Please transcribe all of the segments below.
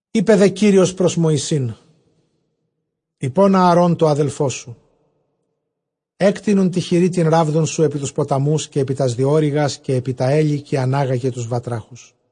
Εἶπε δὲ Κύριος πρὸς Μωυσῆν, εἶπον Ἀαρὼν τῷ ἀδελφῷ σου, ἔκτεινον τῇ χειρὶ τὴν ῥάβδον σου ἐπὶ τοὺς ποταμοὺς, καὶ ἐπὶ τὰς διώρυγας, καὶ ἐπὶ τὰ ἕλη, καὶ ἀνάγαγε τοὺς βατράχους.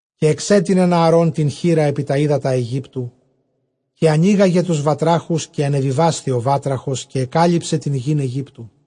Καὶ ἐξέτεινεν Ἀαρὼν τὴν χεῖρα ἐπὶ τὰ ὕδατα Αἰγύπτου, καὶ ἀνήγαγε τοὺς βατράχους· καὶ ἀνεβιβάσθη ὁ βάτραχος, καὶ ἐκάλυψε τὴν γῆν Αἰγύπτου.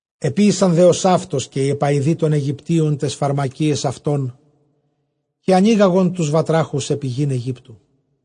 Ἐποίησαν δὲ ὡσαύτως καὶ οἱ ἐπαοιδοὶ τῶν Αἰγυπτίων ταῖς φαρμακίαις αὐτῶν, καὶ ἀνήγαγον τοὺς βατράχους ἐπὶ γῆν Αἰγύπτου.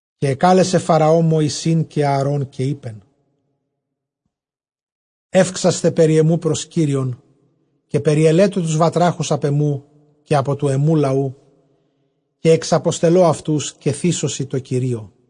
Καὶ ἐκάλεσε Φαραὼ Μωυσῆν καὶ Ἀαρὼν, καὶ εἶπεν, εὔξασθε περὶ ἐμοῦ πρὸς Κύριον, καὶ περιελέτω τοὺς βατράχους ἀπʼ ἐμοῦ, καὶ ἀπὸ τοῦ ἐμοῦ λαοῦ· καὶ ἐξαποστελῶ αὐτοὺς, καὶ θύσωσι τῷ Κυρίῳ.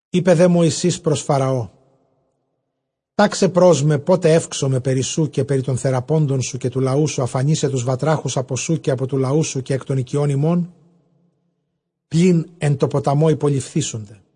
Εἶπε δὲ Μωυσῆς πρὸς Φαραὼ, τάξαι πρὸς με πότε εὔξομαι περὶ σοῦ, καὶ περὶ τῶν θεραπόντων σου, καὶ τοῦ λαοῦ σου, ἀφανίσαι τοὺς βατράχους ἀπὸ σοῦ, καὶ ἀπὸ τοῦ λαοῦ σου, καὶ ἐκ τῶν οἰκιῶν ὑμῶν, πλὴν ἐν τῷ ποταμῷ ὑπολειφθήσονται.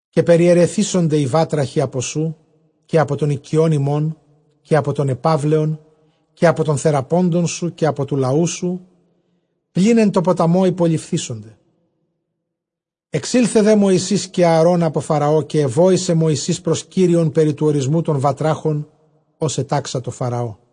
Καὶ περιαιρεθήσονται οἱ βάτραχοι ἀπὸ σοῦ, καὶ ἀπὸ τῶν οἰκιῶν ὑμῶν, καὶ ἀπὸ τῶν ἐπαύλεων, καὶ ἀπὸ τῶν θεραπόντων σου, καὶ ἀπὸ τοῦ λαοῦ σου, πλὴν ἐν τῷ ποταμῷ ὑπολειφθήσονται. Ἐξῆλθε δὲ Μωυσῆς καὶ Ἀαρὼν ἀπὸ Φαραώ· καὶ ἐβόησε Μωυσῆς πρὸς Κύριον περὶ τοῦ ὁρισμοῦ τῶν βατράχων, ὡς ἐτάξατο Φαραώ.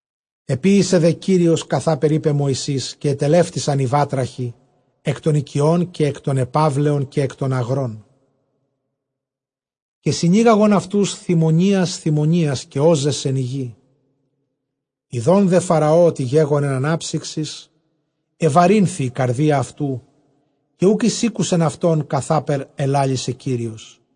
Ἐποιήσε δὲ Κύριος καθάπερ εἶπε Μωυσῆς· καὶ ἐτελεύτησαν οἱ βάτραχοι ἐκ τῶν οἰκιῶν, καὶ ἐκ τῶν ἐπαύλεων, καὶ ἐκ τῶν ἀγρῶν. Καὶ συνήγαγον αὐτοὺς, θημωνίας θημωνίας· καὶ ὤζεσεν ἡ γῆ. Ἰδὼν δὲ Φαραὼ ὅτι γέγονεν ἀνάψυξις, ἐβαρύνθη ἡ καρδία αὐτοῦ, καὶ οὐκ εἰσήκουσεν αὐτῶν, καθάπερ ἐλάλησε Κύριος.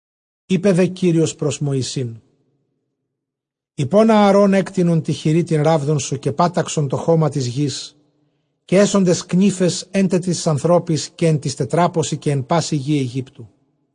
Εἶπε δὲ Κύριος πρὸς Μωυσῆν, εἶπον Ἀαρὼν, ἔκτεινον τῇ χειρὶ τὴν ῥάβδον σου, καὶ πάταξον τὸ χῶμα τῆς γῆς· καὶ ἔσονται σκνίφες ἔν τε τοῖς ἀνθρώποις, καὶ ἐν τοῖς τετράποσι, καὶ ἐν πάσῃ γῇ Αἰγύπτου.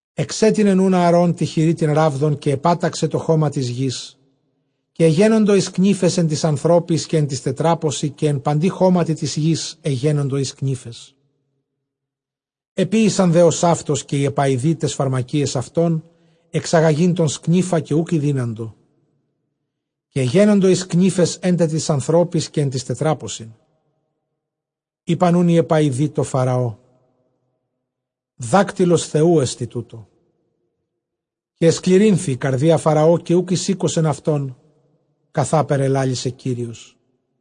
Ἐξέτεινεν οὖν Ἀαρὼν τῇ χειρὶ τὴν ῥάβδον, καὶ ἐπάταξε τὸ χῶμα τῆς γῆς· καὶ ἐγένοντο οἱ σκνίφες ἐν τοῖς ἀνθρώποις, ἔν τε τοῖς τετράποσι, καὶ ἐν παντὶ χώματι τῆς γῆς ἐγένοντο οἱ σκνίφες. Ἐποίησαν δὲ ὡσαύτως καὶ οἱ ἐπαοιδοὶ ταῖς φαρμακίαις αὐτῶν, ἐξαγαγεῖν τὸν σκνῖφα, καὶ οὐκ ἠδύναντο· καὶ ἐγένοντο οἱ σκνίφες ἔν τε τοῖς ἀνθρώποις, καὶ ἐν τοῖς τετράποσιν. Εἶπαν οὖν οἱ ἐπαοιδοὶ τῷ Φαραῷ, δάκτυλος Θεοῦ ἐστι τοῦτο· καὶ ἐσκληρύνθη ἡ καρδία Φαραὼ, καὶ οὐκ εἰσήκουσεν αὐτῶν, καθάπερ ἐλάλησε Κύριος.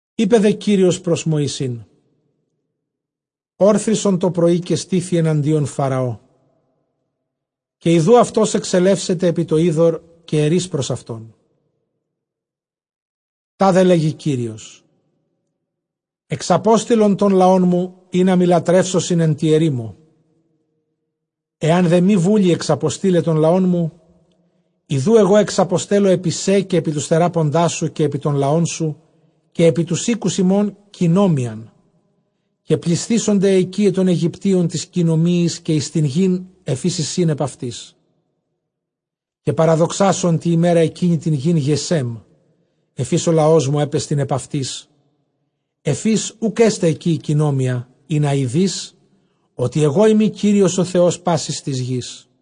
Εἶπε δὲ Κύριος πρὸς Μωυσῆν, ὄρθρισον τὸ πρωΐ, καὶ στῆθι ἐναντίον Φαραώ· καὶ ἰδοὺ αὐτὸς ἐξελεύσεται ἐπὶ τὸ ὕδωρ· καὶ ἐρεῖς πρὸς αὐτὸν, τάδε λέγει Κύριος, ἐξαπόστειλον τὸν λαόν μου, ἵνα μοι λατρεύσωσιν ἐν τῇ ἐρήμῳ. Ἐὰν δὲ μὴ βούλει ἐξαποστεῖλαι τὸν λαόν μου, ἰδοὺ ἐγὼ ἐξαποστέλλω ἐπὶ σὲ, καὶ ἐπὶ τοὺς θεράποντάς σου, καὶ ἐπὶ τὸν λαόν σου, καὶ ἐπὶ τοὺς οἴκους ὑμῶν, κυνόμυιαν· καὶ πλησθήσονται αἱ οἰκίαι τῶν Αἰγυπτίων τῆς κυνομυίης, καὶ εἰς τὴν γῆν ἐφʼ ἧς εἰσιν ἐπʼ αὐτῆς. Καὶ παραδοξάσω ἐν τῇ ἡμέρᾳ ἐκείνῃ τὴν γῆν Γεσὲμ, ἐφʼ ἧς ὁ λαός μου ἔπεστιν ἐπʼ αὐτῆς, ἐφʼ ἧς οὐκ ἔσται ἐκεῖ ἡ κυνόμυια· ἵνα εἰδῇς ὅτι ἐγώ εἰμι Κύριος ὁ Θεὸς πάσης τῆς γῆς.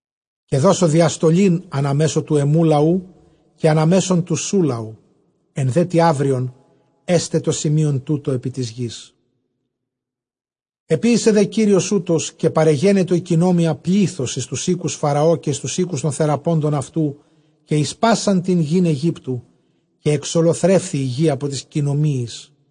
Καὶ δώσω διαστολὴν ἀνὰ μέσον τοῦ ἐμοῦ λαοῦ, καὶ ἀνὰ μέσον τοῦ σου λαοῦ· ἐν δὲ τῇ αὔριον ἔσται τοῦτο ἐπὶ τῆς γῆς. Ἐποίησε δὲ Κύριος οὕτως· καὶ παρεγένετο ἡ κυνόμυια πλῆθος εἰς τοὺς οἴκους Φαραὼ, καὶ εἰς τοὺς οἴκους τῶν θεραπόντων αὐτοῦ, καὶ εἰς πᾶσαν τὴν γῆν Αἰγύπτου· καὶ ἐξωλοθρεύθη ἡ γῆ ἀπὸ τῆς κυνομυίης.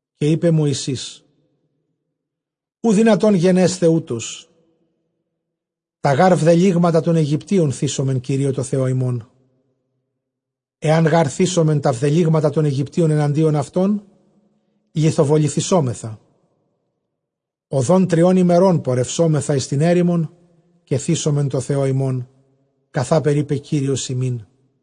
Καὶ εἶπε Μωυσῆς, οὐ δυνατὸν γενέσθαι οὕτως· τὰ γὰρ βδελύγματα τῶν Αἰγυπτίων θύσομεν Κυρίῳ τῷ Θεῷ ἡμῶν· ἐὰν γὰρ θύσωμεν τὰ βδελύγματα τῶν Αἰγυπτίων ἐναντίον αὐτῶν, λιθοβοληθησόμεθα. Ὁδὸν τριῶν ἡμερῶν πορευσόμεθα εἰς τὴν ἔρημον· καὶ θύσομεν τῷ Θεῷ ἡμῶν, καθάπερ εἶπεν Κύριος ἡμῖν.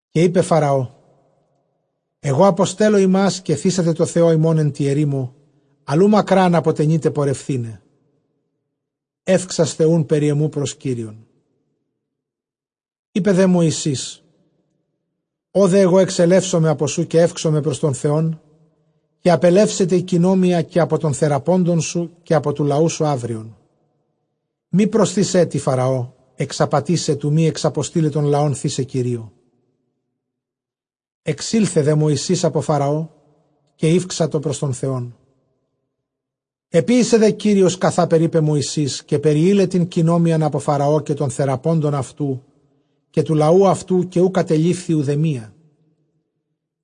Καὶ εἶπε Φαραὼ, ἐγὼ ἀποστέλλω ὑμᾶς, καὶ θύσατε τῷ Θεῷ ὑμῶν ἐν τῇ ἐρήμῳ· ἀλλʼ οὐ μακρὰν ἀποτενεῖτε πορευθῆναι· εὔξασθε οὖν περὶ ἐμοῦ πρὸς Κύριον. Εἶπε δὲ Μωυσῆς, ὁ δὲ ἐγὼ ἐξελεύσομαι ἀπὸ σοῦ, καὶ εὔξομαι πρὸς τὸν Θεὸν, καὶ ἀπελεύσεται ἡ κυνόμυια καὶ ἀπὸ τῶν θεραπόντων σου, καὶ ἀπὸ τοῦ λαοῦ σου αὔριον· μὴ προσθῇς ἔτι Φαραὼ ἐξαπατῆσαι, τοῦ μὴ ἐξαποστεῖλαι τὸν λαὸν θῦσαι Κυρίῳ. Ἐξῆλθε δὲ Μωυσῆς ἀπὸ Φαραὼ, καὶ ηὔξατο πρὸς τὸν Θεόν. Ἐποίησε δὲ Κύριος καθάπερ εἶπε Μωυσῆς· καὶ περιεῖλε τὴν κυνόμυιαν ἀπὸ Φαραὼ, καὶ τῶν θεραπόντων αὐτοῦ, καὶ τοῦ λαοῦ αὐτοῦ, καὶ οὐ κατελείφθη οὐδεμία.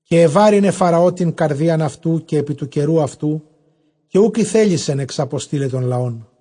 Καὶ ἐβάρυνε Φαραὼ τὴν καρδίαν αὐτοῦ καὶ ἐπὶ τοῦ καιροῦ τούτου, καὶ οὐκ ἠθέλησεν ἐξαποστεῖλαι τὸν λαόν.